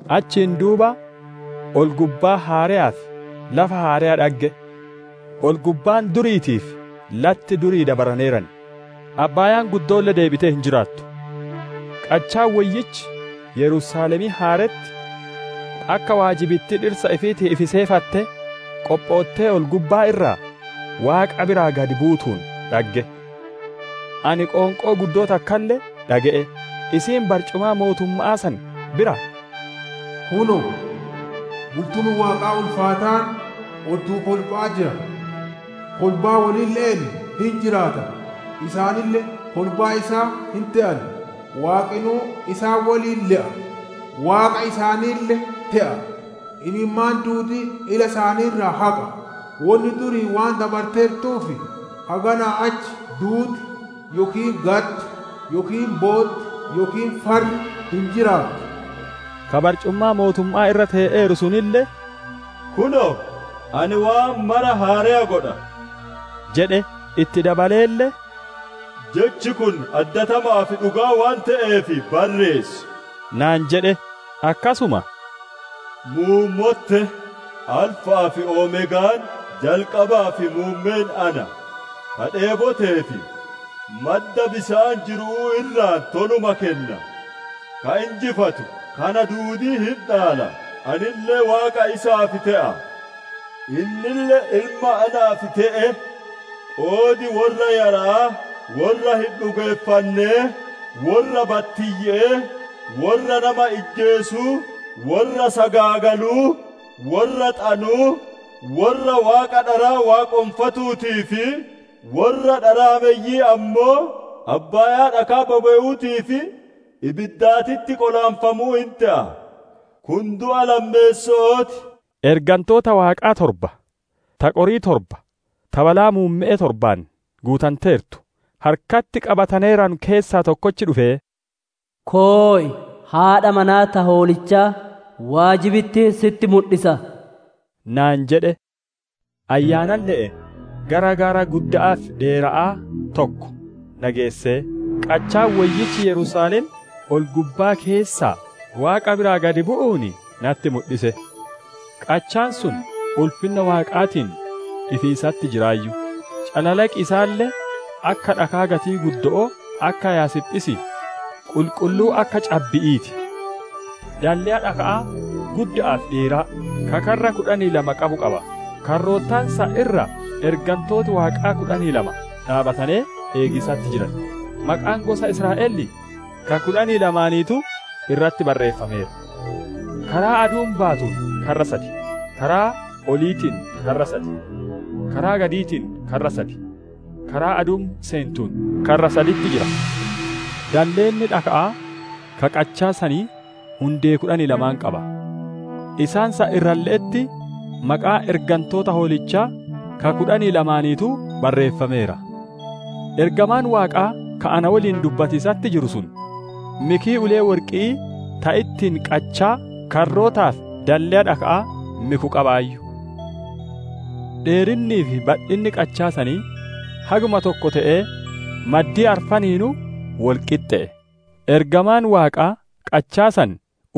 Achiin duuba ol-gubbaa haareyaa fi lafa haareya dhagge; ol-gubbaan duriitii fi latti durii dabaraneeran, abbaayaan guddoolle deebitee hin jiraattu. Qachaan woyyichi, Yerusaalemiin haaretti, akka waajibittii dhirsa ifiitiif ifi seefattee, qophoottee ol-gubbaa irraa Waaqa biraa gadi buutuun dhagge. Ani qoonqoo guddoo takkalle dhage'e; isiin barcumaa mootumma'aa san biraa, «Kunoo, bultumi Waaqaa ulfaataan odduu kolba'aa jira; kolbaa wolille'een hin jiraata; isaanille kolbaa isaa hin te'an. Waaqinuu isaan woliin le'a; Waaqa isaaniille te'a. Imimmaan duudii ila isaanii irraa haqa; wonni durii waan dabarteertuuf, haganaa achi duuti, yookiin gaddi, yookiin bootti, yookiin farri hin jiraattu» jedhe. Ka barcumaa mootumma'aa irra tee'eeru sunille, «Kunoo, ani waan mara haareya godha!» jedhe; itti dabaleelle, «Jechi kun addatama'aa fi dhugaa waan te'eef barreessi» naan jedhe. Akkasuma, «Muummotte! Alfa'aa fi Omeegaan, jalqabaa fi muummeen ana; ka dheeboteef madda bisaan jiru'uu irraa toluma kenna. Ka injifatu, kana duudii hin dhaala; anille Waaqa isaaf te'a, innille ilma naaf te'e. Qoodi worra yara'aa, worra hin dhugeeffannee, worra battiyye'ee, worra nama ijjeesuu, worra sagaagaluu, worra xanuu, worra waaqa dharaa waaqonfatuutii fi worra dharaameyyi'ii ammoo, abbaayaa dhakaa bobe'uutii fi ibiddaatitti qolaanfamuu hin te'a. Kun du'a lammeesso'oo ti» naan jedhe. Ergantoota Waaqaa torba, ta qorii torba ta balaa muumme'ee torbaan guutanteertu harkatti qabataneeranu keessaa tokkochi dhufee, «Koy; haadha manaa ta Hoolichaa, waajibittii sitti mudhisa» naan jedhe. Ayyaanalle'een gara gaara gudda'aa fi dheera'aa tokko na geessee, qachaan woyyichi Yerusaalem, ol-gubbaa keessaa Waaqa biraa gadi bu'uun natti mudhise. Qachaan sun ulfinna Waaqaatiin ifiisatti jiraayyu; calalaqi isaalle akka dhakaa gatii guddo'oo, akka Yaasphisii, qulqulluu akka cabbi'ii ti. Dalleya dhaka'aa gudda'aa fi dheeraa, ka karra kudhanii lama qabu qaba; karroota san irra ergantooti Waaqaa kudhanii lama dhaabbatanee eegiisatti jiran; maqaan gosa Israa'elii ka kudhanii lamaaniituu irratti barreeffameera. Karaa aduun baatuun karra sad, karaa oliitiin karra sad, karaa gadiitiin karra sad, karaa aduun seentuun karra saditti jira. Dalleenni dhaka'aa ka qachaa sanii hundee kudhanii lama qaba; isaan san irralle'etti, maqaan ergantoota Hoolichaa ka kudhanii lamaaniituu barreeffameera. Ergamaan Waaqaa ka na woliin dubbatiisatti jiru sun mikii ulee worqi'ii ta ittiin qachaa, karrootaa fi dalleya dhaka'aa miku qabaayyu. Dheerinnii fi badhinni qachaa sanii haguma tokko te'ee, maddii arfaniinuu wol qixxe'e; ergamaan Waaqaa qachaa san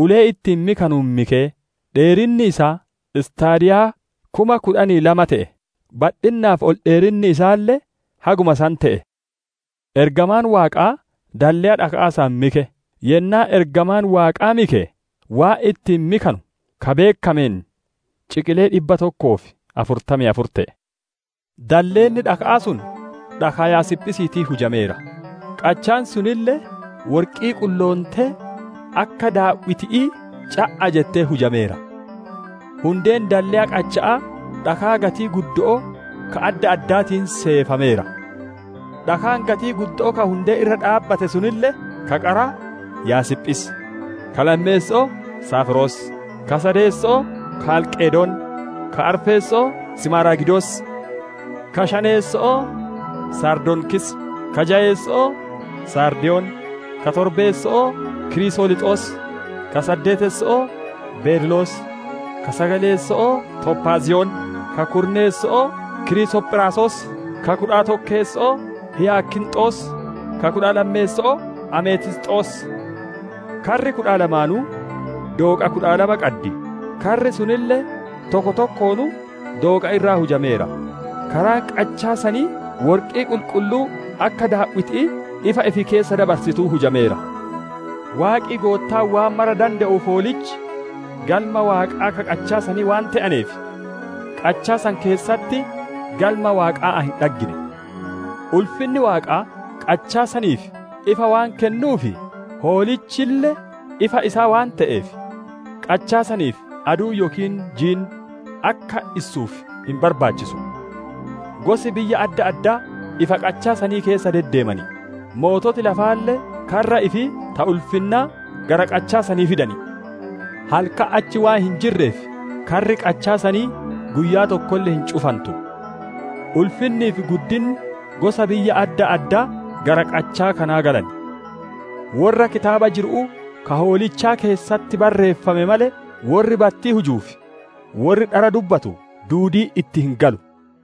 ulee ittiin mikanuun mikee, dheerinni isaa staadiyaa kuma kudhanii lama te'e; badhinnaa fi ol dheerinni isaalle haguma san te'e. Ergamaan Waaqaa dalleya dhaka'aa san mike; yennaa ergamaan Waaqaa mike, waan ittiin mikanu ka beekkameen ciqilee dhibba tokkoo fi afurtamii afur te'e. Dalleenni dhaka'aa sun dhakaa Yaasphisiitiin hujameera; qachaan sunille worqii qulloontee akka daaw'iti'ii ca'a jetteen hujameera. Hundeen dalleya qacha'aa dhakaa gatii guddo'oo ka adda addaatiin seefameera. Dhakaan gatii guddo'oo ka hundeen irra dhaabbate sunille: ka qaraa Yaasphis, ka lammeesso'oo Safiiros, ka sadeesso'oo Kaalqedon, ka arfeesso'oo Simaaragidos, ka shaneesso'oo sardoniikis, ka jayeesso'oo saardiyon, ka torbeesso'oo kirisoliixos, ka saddeetesso'oo beerilos, ka sagaleesso'oo tophaaziyon, ka kudhaneesso'oo kirisophiraasos, ka kudha tokkeesso'oo Hiiyaakinxos, ka kudha lammeesso'oo ametiisxos. Karri kudha lamaanuu dooqa kudha lama qaddi; karri sunille tokko tokkonuu dooqa irraa hujameera; karaan qachaa sanii worqii qulqulluu akka daaw'itii ifa ifi keessa dabarsituutiin hujameera. Waaqi Goottaan waan mara dande'uu fi Hoolichi Galma Waaqaa ka qachaa sanii waan te'aneef, qachaa san keessatti Galma Waaqaa ani hin dhaggine. Ulfinni Waaqaa, qachaa saniif ifa waan kennuu fi Hoolichille ifa isaa waan te'eef, qachaa saniif aduun yookiin jiin akka issuuf hin barbaachisu. Gosi biyya adda addaa ifa qachaa sanii keessa deddeeman; moototi lafaalle karra ifii ta ulfinnaa gara qachaa sanii fidan. Halkan achi waan hin jirreef, karri qachaa sanii guyyaa tokkolle hin cufantu. Ulfinnii fi guddinni gosa biyya adda addaa gara qachaa kanaa galan. Worra kitaaba jiru'uu, ka Hoolichaa keessatti barreeffame malee, worri battii hujuu fi worri dhara dubbatu duudiin itti hin galu.